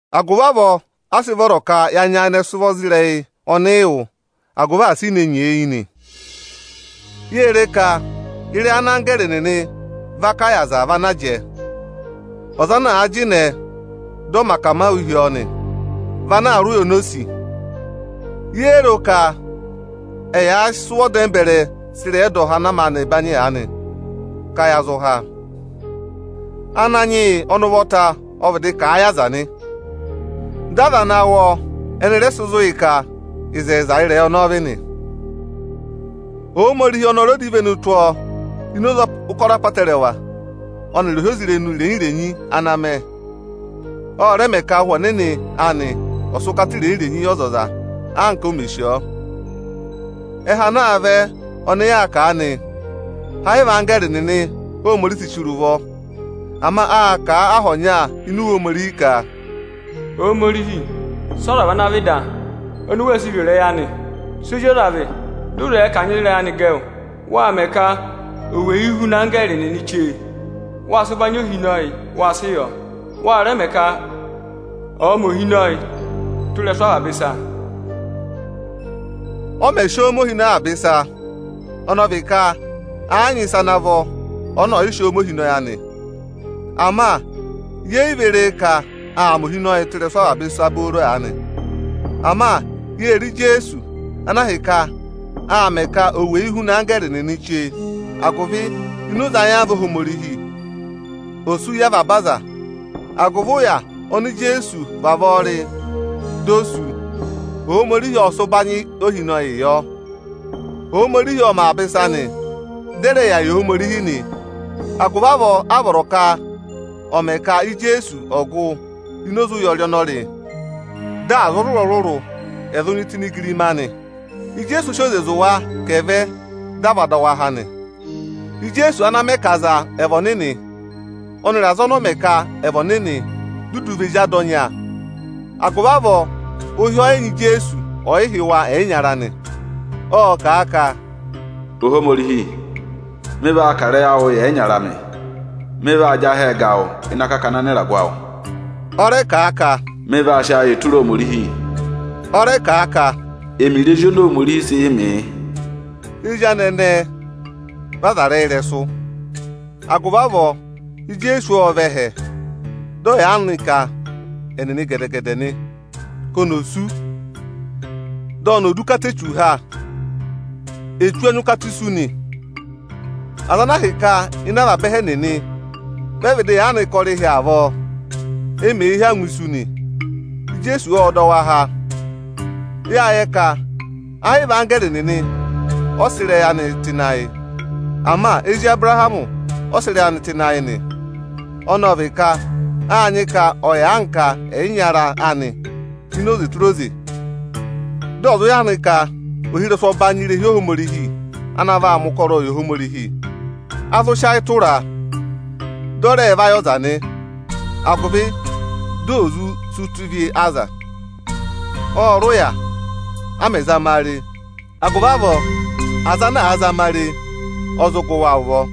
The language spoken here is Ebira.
Agụvị avọọ a sị vọrọ ka ya nyayịnẹ sị ụvọ za ịrẹyị ọnị ị wụ́, agụvị asị i ne nyeeyi nị. Yée re ka ịrẹyị ana anggẹẹrị nịnị va kà yị aza vị ana jẹẹ. Ọza ana àa jịnẹẹ, dị ọ mẹ akamawụ hi ọọ nị, vị ana aa rị ụya oni o sì. Yéé ro ka ẹyị àa sị ụvọ dẹmbẹrẹ sị ịrẹyị ẹdọha ana maanị banyị aanị, ka ya zụ há? Ananyị yị ọnị ụvọta ọ vịdị kà a yị aza nị. Dị aza ana wụ́ ọọ ẹnị rẹ sị zụ̀ yị ka ịzẹyịza ị́rẹyị ọnọọ vị nị. Ohomorihi ọnị ọ rẹ dọ ivenu tụ́ ọọ ini oze ụkọrọ apọtẹrẹwa ọnịrị ohyozirenu irenyi-irenyi ana aa mẹ; ọ rẹ mẹ ka Ụhwẹ Ọnịnị anị ọ̀ sị ụkata irenyi-irenyi yị ọzọza anka o mè sì ọọ. Ẹhẹ ana aa vẹ ọnị yaa kà aanị, ẹ́ yị vị anggẹẹrị nịnị Óhomorihi si chire ụvọ. Ama â kà a aha ọnya ini Iwe Ohomorihi ka, “Ohomorihi, sị ọza vị ana vị da, oni u wee sii ro ịrẹyị anị? Sị ozi ọza vị, dị ụ zẹẹ ka à nyị ịzị ịrẹyị anị gẹ wụ? Wáa mẹ ka ò weyi huna anggẹẹrị nịnị chee. Wáa sị ụbanyị ohinọyị, wáa sị yọ. Wa rẹ mẹẹ ka ọ̀ọ mẹ ohinọyịị tụ́ ịrẹsụ avaba ịsa.” Ọ mẹ̀ sị ọọ mẹ ohinọyị avaba ịsa, ọnị ọ vị ka ẹ́ yị nyị ịsa ana vọ ọnị ọ̀yị sị ọọ mẹ ohinọyị anị. Ama yeè yi ve re ka aa mẹ ohinọyịị tụ́ ịrẹsụ avaba ịsa booro aanị. Ama yée re Ijeesu, ana ahịka â mẹẹ ka ò weyi huna anggẹẹrị nịnị chee, agụvị ini oze ayamva Ohomorihi, dị ò sú yị avaba aza. Agụvị ụya ọnọọ oni Ijeesu vavọọ rị dị o sú, Ohomorihi ọ́ọ sị ụbanyị ohinọyịị yọ. Ohomorihi ọ mẹ avaba ịsa nị, dị ẹ rẹ vị Óhomorihi nị. Agụvị avọọ áa vọrọ ka ọ̀ mẹ ka Ijeesu ọ̀ gụ ini oze ụya ọnị ọ rị, dị aza ọrụrụ-ọrụrụ ẹ̀ zụ nyị tụ́ ini igirima anị. Ijeesu ọ sị oze zụ̀ wa ka ẹ̀ vẹ, dị à va dọ wa há nị. Ijeesu ana mẹ ka aza ẹ̀ vị ọnịnị, ọnịrị aza ọnị ọ mẹ ka ẹ̀ vị ọnịnị vi ene dudu nyị Ada ọnya. Agụvị avọọ ụhị ọyị nyị Ijeesu ọyịhị́ wa ẹyịnyara anị. Ộ kà a ka, “Ohomorihi, mị vaa kà ịrẹyị awụụ yị ẹyịnyara amị; mị vaa jị ahẹ ga wụ ịnị akakana anịragụ awụ.” Ọ rẹ kà a ka, “Mị vaa sị ayịị tụra Ohomorihi.” Ọ rẹ kà a ka, “Ẹmịrị ezi oni Ohomorihi sị yị mị, yị.” Ezi anị ẹnẹẹ vị aza rị ẹyị ị́rẹsụ. Agụvị avọọ, Ijeesu ọ́ọ vẹ ẹhẹ dị ọ yà anka ẹnịnị gẹdẹ-gẹdẹ nị, ka oni ò sú, di oni ò du ụkata Echu ha. Echu ọ nyị ụkata isu nị. Aza ana ahịka ịnị avaba ẹhẹ ẹnịnị, vị ẹ vịdị yà anka ọrịhị avọọ, e mèe hí angwa isu nị, Ijeesu ộ dọ wa há. Yáa yẹ ka ayị vị anggẹẹrị nịnị ọ sị ịrẹyị anị tụ́ ịnị ayị. Ama ezi Abụrahamị ọ sị ịrẹyị anị tụ́ ịnị ayị nị. Ọnọọ ọ vị ka áa nyị ka ọ̀ yà anka ẹyịnyara anị ini oze tụra oze, dị ọ̀ zụ yà anka ohirẹsụ ọbanyị irehi Ohomorihi ana vaa mẹ ụkọrọọ yị Ohomorihi. A zụ sị ayị tụraa, dị ọ rẹẹ̄ vayị ọza nị, agụvị dị ò zụ sí ụta ịvị aza. Ộ rị ụya, a mẹ̀ zama a re; agụvị avọọ aza ana àaa zama a re, ọ zụ gụ wa ụvọ.